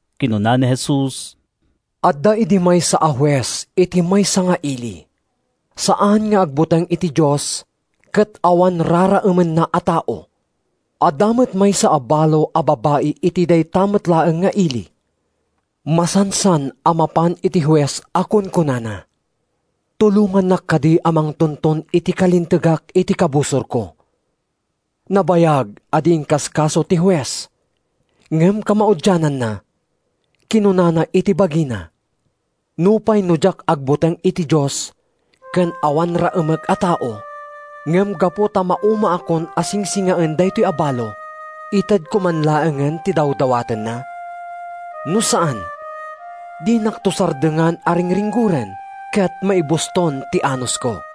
Kinuna ni Jesus, “Adda idi maysa a hues iti maysa nga ili. Saan nga agbuteng iti Dios ket awan raraemenna a tao. “Adda met maysa a balo a babai iti dayta met laeng nga ili. Masansan a mapan iti hues a kunkunana, ‘Tulongannak kadi a mangtunton iti kalintegak iti kabusorko!’ “Nabayag a di inkaskaso ti hues, ngem kamaudiananna, kinunana iti bagina, ‘Nupay no diak agbuteng iti Dios ken awan raemek a tao, ngem gapu ta maumaakon a singsingaen daytoy a balo, itedko man laengen ti dawdawatenna. No saan, dinakto sardengan a ringringgoren ket maibuston ti anusko.’”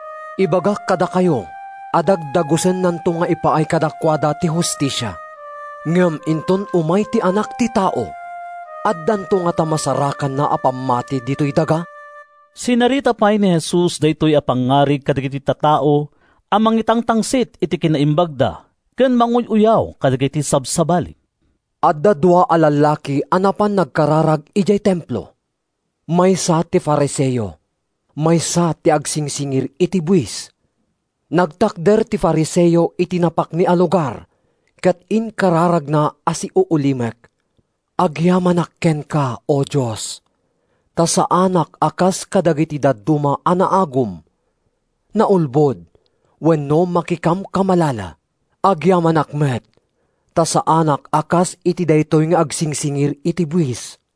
Ibagak kadakayo a dagdagusennanto nga ipaay kadakuada ti hustisia. Ngem inton umay ti Anak ti Tao, addanto ngata masarakanna a pammati ditoy daga?” Sinarita pay ni Jesus daytoy a pangngarig kadagiti tattao a mangitangtangsit iti kinaimbagda ken manguy-uyaw kadagiti sabsabali. “Adda dua a lallaki a napan nagkararag idiay Templo: maysa ti Fariseo, maysa ti agsingsingir iti buis. “Nagtakder ti Fariseo iti napakni a lugar ket inkararagna a siuulimek: ‘Agyamanak kenka, O Dios, ta saanak a kas kadagiti dadduma a naagum, naulbod wenno makikamkamalala. Agyamanak met ta saanak a kas iti daytoy nga agsingsingir iti buis.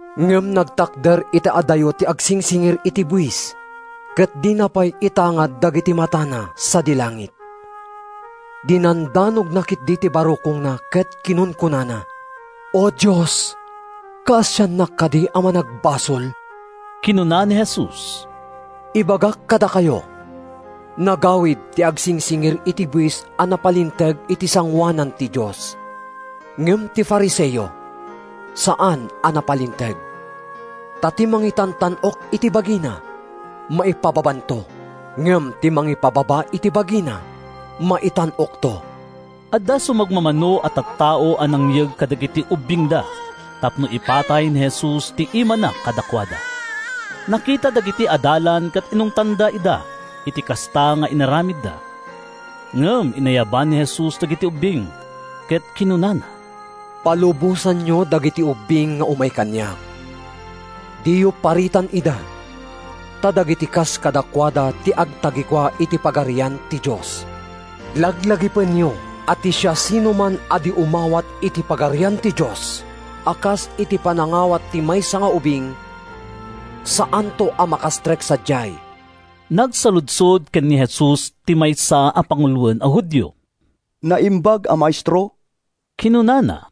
“Ngem nagtakder iti adayo ti agsingsingir iti buis ket dina pay itangad dagiti matana sadi langit. Dinandanogna ketdi ti barukongna ket kinunkunana, ‘O Dios, kaasiannak kadi a managbasol!’” Kinuna ni Jesus, “Ibagak kadakayo, nagawid ti agsingsingir iti buis a napalinteg iti sangoanan ti Dios. Ngem ti Fariseo, saan a napalinteg. Ta ti mangitantan-ok iti bagina, maipababanto. Ngem ti mangipababa iti bagina, maitan-okto.” Adda sumagmamano a tattao a nangyeg kadagiti ubbingda tapno ipatay ni Jesus ti imana kadakuada. Nakita dagiti adalan ket inungtanda ida iti kasta nga inaramidda. Ngem inayaban ni Jesus dagiti ubbing, ket kinunana, “Palubosanyo dagiti ubbing nga umay kaniak. Diyo paritan ida, ta dagiti kas kadakuada ti agtagikua iti Pagarian ti Dios. Laglagipenyo a ti siasinoman a di umawat iti Pagarian ti Dios a kas iti panangawat ti maysa nga ubing, saanto a makastrek sadiay.” Nagsaludsod ken ni Jesus ti maysa a panguloen a Judio. “Naimbag a Maestro,” kinunana,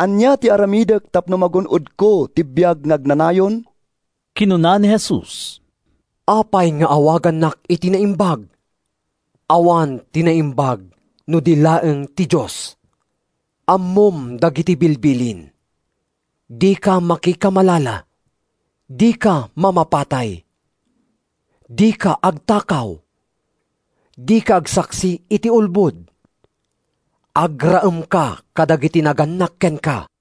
“ania ti aramidek tapno magun-odko ti biag nga agnanayon?” Kinuna ni Jesus, “Apay nga awagannak iti naimbag? Awan ti naimbag no di laeng ti Dios. Ammom dagiti bilbilin: ‘Dika makikamalala; dika mamapatay; dika agtakaw; dika agsaksi iti ulbod; agraemka kadagiti nagannak kenka.’”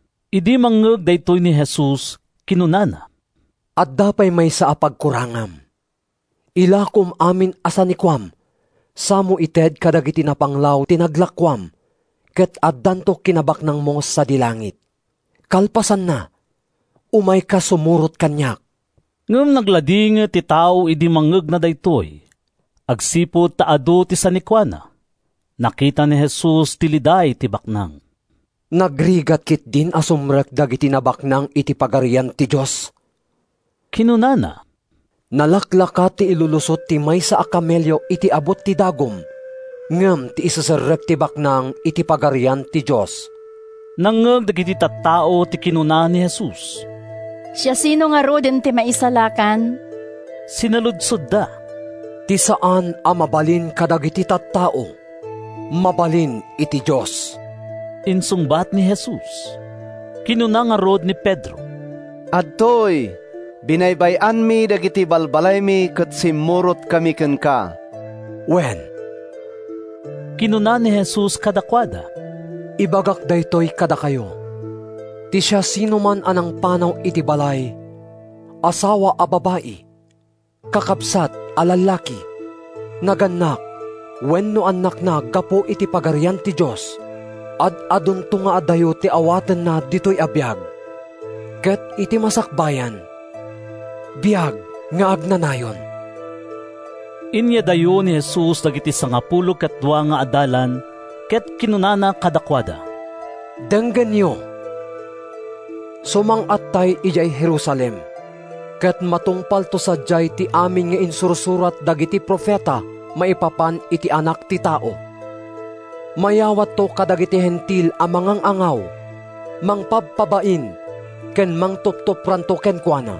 Idi mangngeg daytoy ni Jesus, kinunana, “Adda pay maysa a pagkurangam. Ilakom amin a sanikuam samo ited kadagiti napanglaw ti naglakoam ket addanto kinabaknangmo sadi langit. Kalpasanna, umayka sumurot kaniak.” Ngem nagladingit ti tao idi mangngegna daytoy, agsipud ta adu ti sanikuana. Nakita ni Jesus ti liday ti baknang. “Nagrigat ketdin a sumrek dagiti nabaknang iti Pagarian ti Dios!” kinunana. “Nalaklaka ti ilulusot ti maysa a kamelio iti abut ti dagum ngem ti iseserrek ti baknang iti Pagarian ti Dios.” Nangngeg dagiti tattao ti kinuna ni Jesus. “Siasino ngaruden ti maisalakan?” sinaludsodda. “Ti saan a mabalin kadagiti tattao, mabalin iti Dios,” insungbat ni Jesus. Kinuna ngarud ni Pedro, “Adtoy, binaybay-anmi dagiti balbalaymi ket simmurotkami kenka.” “Wen,” kinuna ni Jesus kadakuada, “ibagak daytoy kadakayo: ti siasinoman a nangpanaw iti balay, asawa a babai, kakabsat a lallaki, nagannak wenno annakna gapu iti Pagarian ti Dios, ad-adunto nga adayo ti awatenna ditoy a biag, ket iti masakbayan, biag nga agnanayon.” Inyadayo ni Jesus dagiti sangapulo ket dua nga adalan ket kinunana kadakuada, “Denggenyo! Sumang-attay idiay Jerusalem, ket matungpalto sadiay ti amin nga insursurat dagiti profeta maipapan iti Anak ti Tao. Mayawatto kadagiti Hentil a mangang-angaw, mangpabpabain ken mangtuptupranto kenkuana.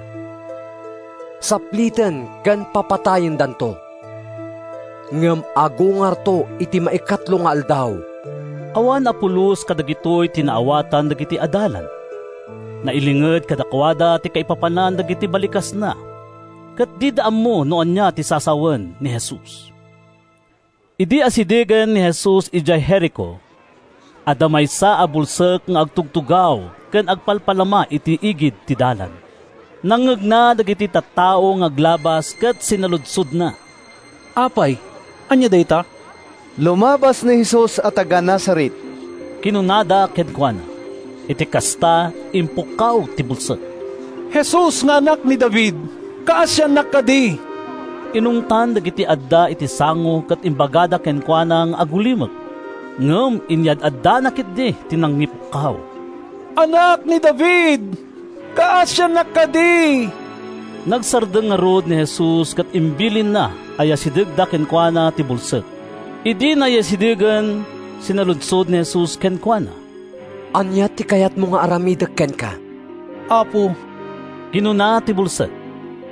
Sapliten ken papatayendanto, ngem agungarto iti maikatlo nga aldaw.” Awan a pulos kadagitoy ti naawatan dagiti adalan. Nailinged kadakuada ti kaipapanan dagiti balikasna, ket dida ammo no ania ti sasawen ni Jesus. Idi asidegen ni Jesus idiay Jerico, adda maysa a bulsek nga agtugtugaw ken agpalpalama iti igid ti dalan. Nangngegna dagiti tattao nga aglabas ket sinaludsodna, “Apay, ania dayta?” “Lumabas ni Jesus a taga-Nazaret,” kinunada kenkuana. Iti kasta, impukkaw ti bulsek, “Jesus nga Anak ni David! Kaasiannak kadi!” Inungtan dagiti adda iti sango ket imbagada kenkuana nga agulimek. Ngem inyad-addana ketdi ti nangipukkaw, “Anak ni David, kaasiannak kadi!” Nagsardeng ngarud ni Jesus ket imbilinna a yasidegda kenkuana ti bulsek. Idi nayasidegen, sinaludsod ni Jesus kenkuana, “Ania ti kayatmo nga aramidek kenka?” “Apo,” kinuna ti bulsek,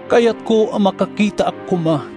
“Kayatko a makakitaak koma.”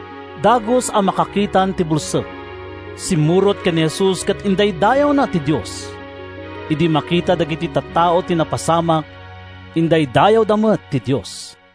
Dagus a makakitan ti bulsek. Simmurot ken ni Jesus ket indaydayawna ti Dios. Idi makita dagiti tattao ti napasamak, indaydayawda met ti Dios.